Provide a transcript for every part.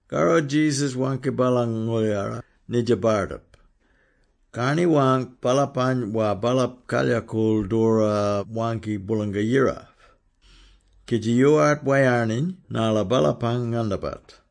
Karro Jesus waangki baalang ngooldjara nidja bardip, karni-waangk baalapany war baalap kalyakool doora waangki Boolanga-Yira, kidji yoowart wayarniny narla baalapang ngandabat.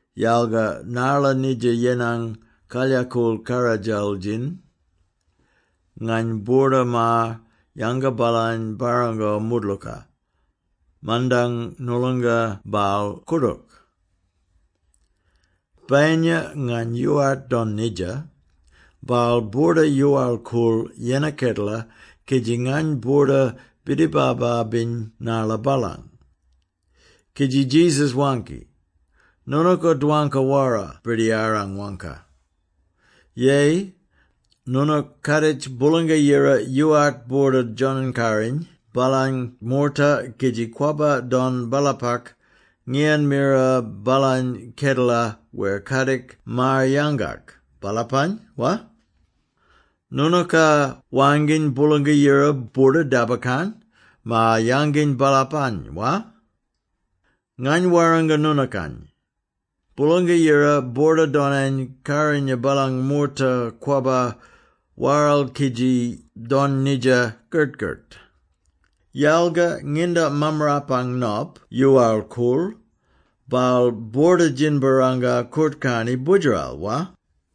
yalga narla nidja yenang kalyakool karradjal-djin, ngany boorda-maar-yanga baalany barrango moodlooka, mandang noolonga baal koordook. ‘Bayinya ngany yoowart don nidja, baal boorda-yoowal-koorl yennar kedela kidji ngany boorda-bidibaba-biny narla baalang.’” Kidji Jesus waangki, “Noonooka dwangka wara birdiyarang waangka! Yeyi, noonook kaaditj Boolanga-Yira yoowart boorda-djonany-karinya baalang moorta kidji kwabba don baalapak ngiyan mira baalany kedela wer kadik maar-yangak baalapany, wa? Noonooka waangkiny Boolanga-Yira boorda-dabakarn maar-yanginy baalapany, wa? Ngany warranga noonookany, Boolanga-Yira boorda-donany-karinya baalang moorta kwabba waral kidji don nidja kert-kert. Yalga nginda Mammarapang Nop yoowal-koorl, baal boorda-djinbarranga koort-karni Boodjeral, wa?”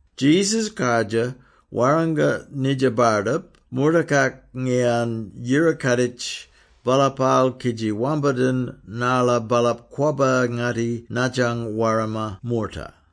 Jesus kardjir warranga nidja bardip moortakak ngiyan yira-kaaditj baalapaal kidji wambadin narla baalap kwabba-ngatti nadjang warma moorta.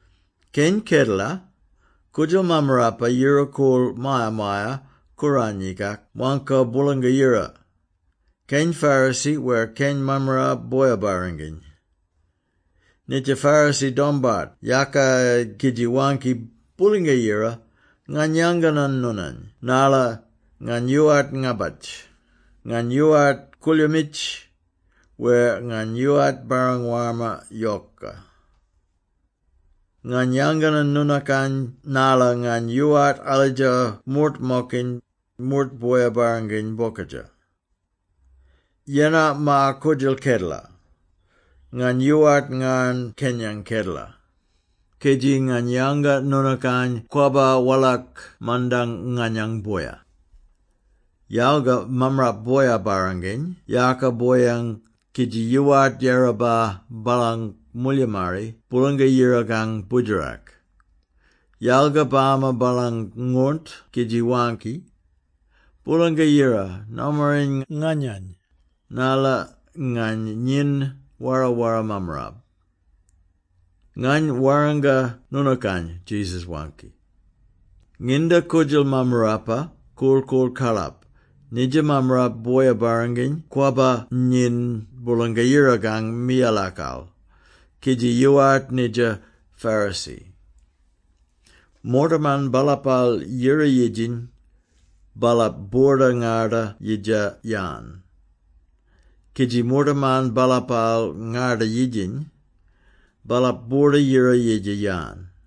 “Keny kedela, koodjal mammarapa yira-koorl Maya-maya-Kooranyikak waangko Boolanga-Yira, keny Pharisee wer keny mammarap boya-barranginy. Nidja Pharisee dombart yaaka kidji waangki, ‘Boolanga Yira, ngany yanganan noonany narla ngany yoowart ngabatj, ngany yoowart koolyoomitj wer ngany yoowart barrang warma yoka. Ngany yanganan noonookany narla ngany yoowart alidja moort-mokiny, moort boya-barranginy bokadja. Yennar maar-koodjal kedela, ngany yoowart ngarn kenyang kedela, kidji ngany yanga noonookany kwabba walak mandang nganyang boya.’ Yalga mammarap boya-barranginy yaaka boyang kidji yoowart yiraba baalang moolyimarri Boolanga Yirakang Boodjerak, yalga bama baalang ngoornt kidji waangki, ‘Boolanga-Yira, nomaring nganyany, narla ngany nyiny wara-wara mammarap.’ Ngany warranga noonookany,” Jesus waangki, “nginda koodjal mammarapa korl-koorl karlap, nidja mammarap boya-barranginy kwabba nyiny Boolanga-Yirakang miyalakal kidji yoowart nidja Pharisee. Moortaman baalapaal yira-yidjiny, baalap boorda-ngarda-yidja-yan, kidji moortaman baalapaal ngarda-yidjiny, baalap boorda-yira-yidja-yan.”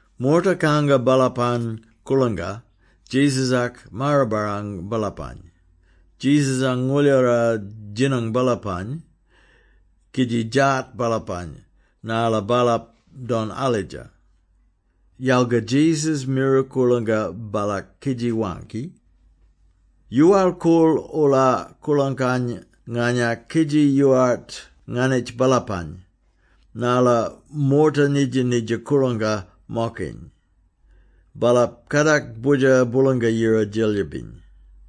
Moorta kanga baalapang koorlangka Jesus-ak maar-barrang baalapany. Jesus-ang ngooldjara djinang baalapany kidji djaat baalapany narla baalap don alidja, yalga Jesus mira koorlangka baalak kidji waangki, “Yoowal-koorl-oola koorlangkany nganyak kidji yoowart nganitj baalapany, narla moorta nidja-nidja koorlangka-mokiny, baalap kadak Boodjer Boolanga-Yira Djelyibiny.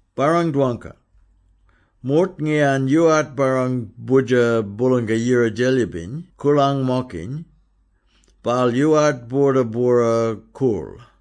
Barrang-dwangka! Moort ngiyan yoowart barrang Boodjer Boolanga-Yira Djelyibiny koorlang-mokiny, baal yoowart boorda-bwora-koorl.”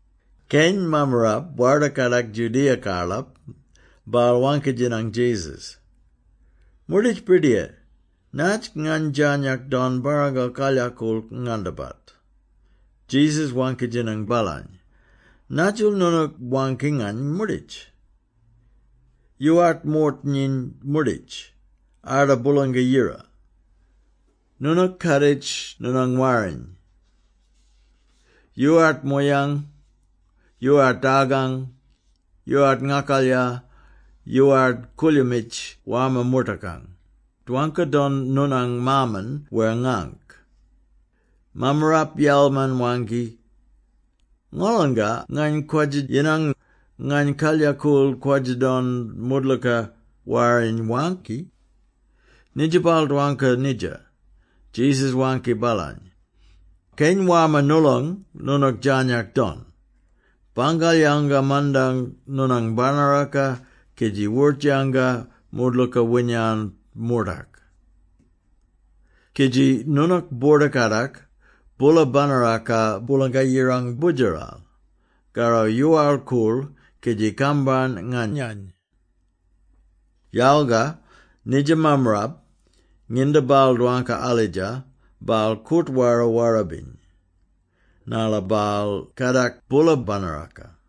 Keny mammarap warda kadak Judea-karlap, baal waangki-djinang Jesus, “Moorditj Birdiyar, natj ngany djarnyak don barrango kalyakool ngandabat?” Jesus waangki-djinang baalany, “Nadjil noonook waangki ngany ‘moorditj’? Yoowart moort nyiny moorditj, arda Boolanga-Yira. Noonook kaaditj noonang Warriny. Yoowart mooyang, yoowart dargang, yoowart ngakalya, yoowart koolyoomitj warma moortakang; dwangka-don noonang maaman wer ngaangk.” Mammarap yalman-waangki, “Ngolonga ngany kwadja-yinang, ngany kalyakool kwadja-don moodlooka Warriny waangki.” Nginda baal dwangka nidja, Jesus waangki baalany, “Keny warma noolong noonook djarnyak don. Bangal-yanga mandang noonang banaraka kidji wort-yanga moodlooka winyan moortak. Kidji noonook boorda-kadak boola banaraka Boolanga-Yirang Boodjeral; karro yoowal-koorl, kidji kambarn nganyany.” Yalga nidja mammarap, nginda baal dwangka alidja, baal koort-wara-wara-biny, narla baal kadak boola banaraka.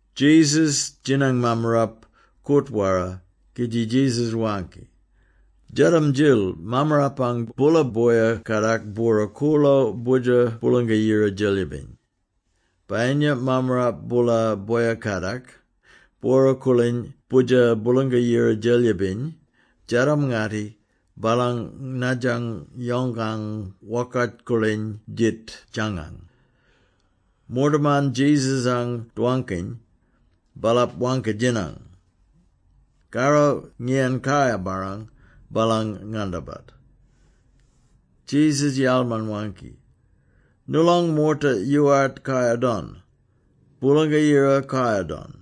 Jesus djinang mammarap koort-wara kidji Jesus waangki, “Djadam-djil mammarpang boola boya-kadak bwora-koorlo Boodjer Boolanga-Yira Djelyibiny! Bayinya mammarap boola boya-kadak, bwora-koorliny Boodjer Boolanga-Yira Djelyibiny djadam-ngatti baalang nadjang yongkang wokart-koorliny djit djangang.” Moortaman Jesus-any dwangkiny, baalap waangki-djinang, “Karro ngiyan kayar-barrang baalang ngandabat?” Jesus yalman-waangki, “Noolong moorta yoowart kayar-don, Boolanga-Yira kayar-don!”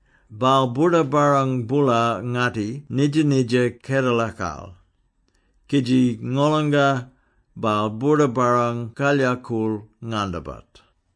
baal boorda-barrang boola-ngatti nidja-nidja kedelakal, kidji ngolonga, baal boorda-barrang kalyakool ngandabat.”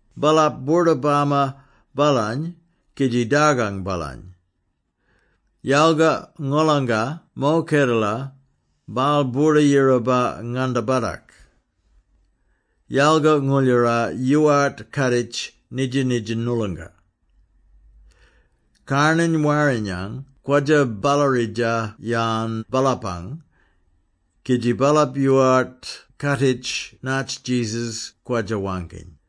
Baalap boorda-bama baalany kidji dargang baalany. Yalga ngolanga mo kedela, baal boorda-yiraba ngandabatak.” Yalga ngooldjara yoowart kaaditji nidja-nidja noolonga; karnany warrinyang kwadja-ballaridja-yan baalapang, kidji baalap yoowart kaaditji natj Jesus kwadja-waangkiny.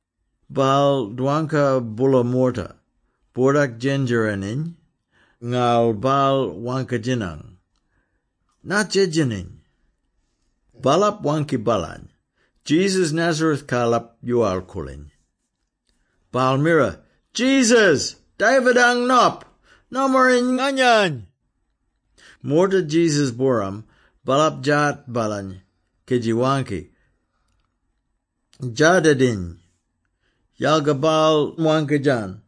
Baal dwangka boola moorta, boordak-djendjereniny, ngarl baal waangki-djinang, “Natj edjeniny?” Baalap waangki baalany, “Jesus Nazareth-karlap yoowal-koorliny.” Baal mira, “Jesus! David-ang Nop! Nomaring nganyany!” Moorta Jesus-booram, baalap djaat baalany kidji waangki, “Dja-dediny.” Yalga baal waangka-djan,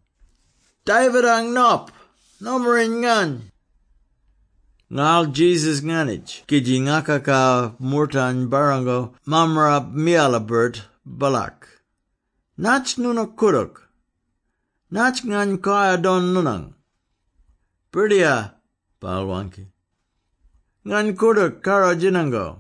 “David-ang Nop! Nomaring ngany!” Ngarl Jesus nganitj kidji ngakaka moortany barrango mammarap miyala-birt baalak. “Natj noonook koodook? Natj ngany kayar don noonang?” “Birdiyar,” baal waangki, “Ngany koordook karro-djinango.”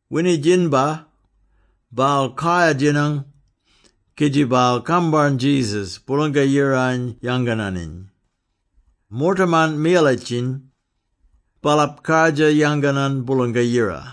Winidjinbar, baal kayar-djinang, kidji baal kambarn Jesus, Boolanga-Yirany yangananiny. Moortaman miyalitjiny, baalap kardjir yanganan Boolanga-Yira.